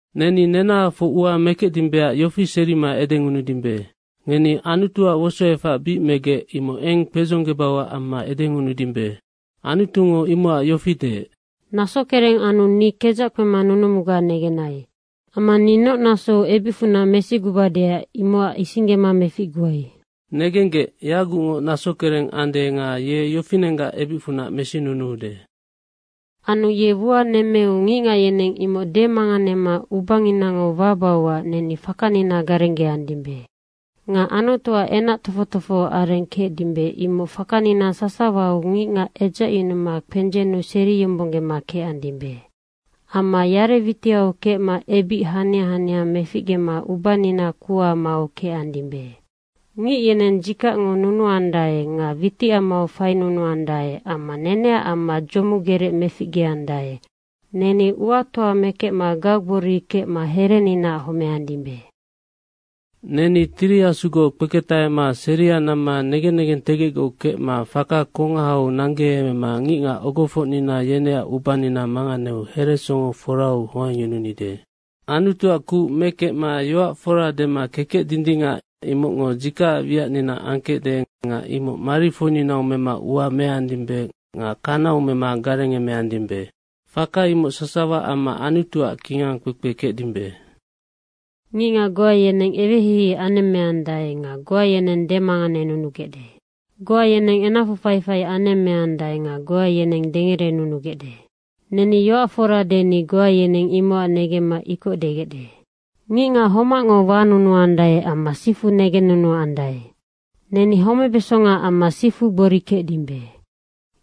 Neni nenahafoc ua mekecdimbeac yofi serima edengunudimbe, “Ngeni Anutuac wosoefac bic megec, imoc eng kpedzonggebauac amma edengunudimbe.” Anutungo imocac yofi deec, “Nasokereng anu ni kedzac kpema nunumuga negenai. Amma ni noc nasou ebicfunac mesigubadeac imocac isinggema meficguai.” Negenggec, yagucngoc nasokereng ande nga ye yofinenggac ebicfunac mesinunuude. Anu ye ua nemmeu ngicngac yeneng imoc demanganema ubanginango wabauac neni fakanina garenggeandimbe. Nga Anutuac kingangkpekpefora kecdimbe, imoc fakanina sasawau ngicngac edzacyunuma kpendzennu seriyombonggema kecandimbe. Amma yare witiau kecma ebic hania hania meficgema ubanina kuha mau kecandimbe. Ngic yeni dzikacngo nunuandae nga witicamau fainunuandae amma neneac amma dzomugerec meficgeandae. Neni uatoa mekecma gaugbori kecma hereninaac homeandimbe. Neni Tiri Asugoc kpeketahema seria namma negen negentegecgoc kecma faka kongahau nanggeemema ngicngac ogofocnina yeneac ubanina manganeu heresongo forau hoangyununide. Anutuac kuc mekecma yoac fora dema kekec dindingac, imocngo dzikacac wiacnina angkecde nga imoc mari foininau mema ua meandimbe nga kanau mema garengemeandimbe, faka imoc sasawa amma Anutuac kingangkpekpe kecdimbe. Ngicngac goa yeneng ewehei anemmeandae nga goa yeneng demanganenunugecde. Goa yeneng enacfu faifai anemmeandae nga goa yeneng dengerenunugecde. Neni yoac fora deni goa yeneng imocac negemma ikoc degecde. Ngicngac homacngo wanunuandae amma sifu negennunuandae. Neni homebeso amma sifu gbori kecdimbe.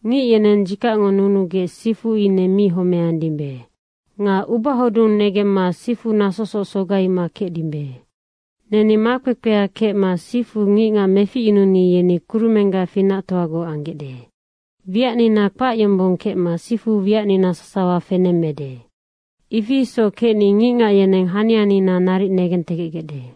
Ngic yeneng dzikacngo nunugec sifu ine mi homeandimbe. Nga ubahodung negemma sifu nasosoc sogaima kecdimbe. Neni makpekpea kecma sifu ngicngac meficyununi yeni kurumenggac finactoagoc anggecde. Wiacnina kpac yombong kecma sifu wiacnina sasawa fenemmede. Ifi isoc kecni ngicngac yeneng hanianina naric negentegecgecde.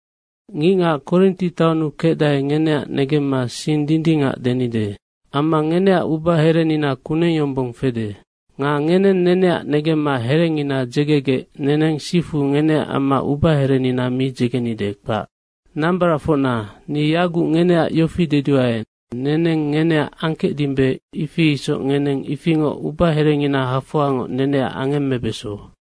Ngicngac Korinti taonnu kecdae, ngeneac negemma sing dindingac denide. Amma ngeneac ubaherenina kuneng yombong fede. Nga ngeneng neneac negemma herengina dzegegec neneng sifu ngeneac amma ubaherenina mi dzegenide, kpac. Nambaracfocna, ni yaguc ngeneac yofi deduae, neneng ngeneac angkecdimbe, ifi isoc ngeneng ifingoc ubaherengina hafoangoc neneac angemmebeso.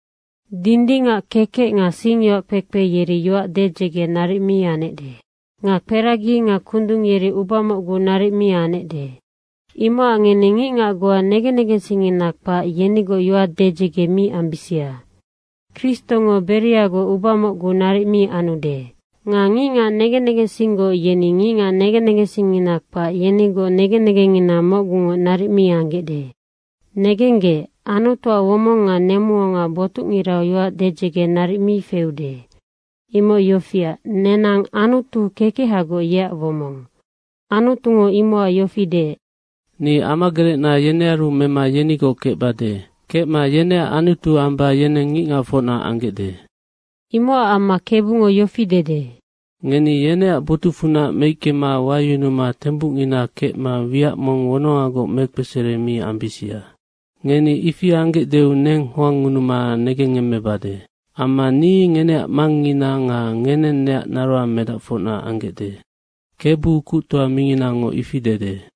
Dindingac kekec nga singyoac kpekpe yeri yoac dedzege naric mi anecde. Nga kperagi nga kundung yeri uba mocgu naric mi anecde. Imocac ngeni ngicngac goa negen negensingngina kpac, yenigoc yoac dedzege mi ambisia. Kristongo Beriagoc uba mocgu naric mi anude. Nga ngicngac negen negensinggoc yeni ngicngac negen negensingngina kpac, yenigoc negen negengngina mocgungoc naric mi anggecde. Negenggec, Anutuac womong nga nemuonga botucngirau yoac dedzege naric mi feude. Imoc yofiac, nenang Anutu kekehagoc, yeac womong. Anutungo imocac yofi deec, “Ni amagerecna yenearu mema yenigoc kecbade. Kecma yeneac Anutu amba yeneng ngicngacfocna anggecde.” Imocac amma, “Kebungo yofi dede, ‘Ngeni yeneac botucfunac meickema wayunuma tembucngina kecma wiac mong wonongagoc mekpesere mi ambisia. Ngeni ifi anggecdeu neng hoangngunuma negengngemmebade. Amma ni ngeneac Mangngina nga ngeneng neac naroang medacfocna anggecde, KEBU Kuctoa Minginango ifi dede.’”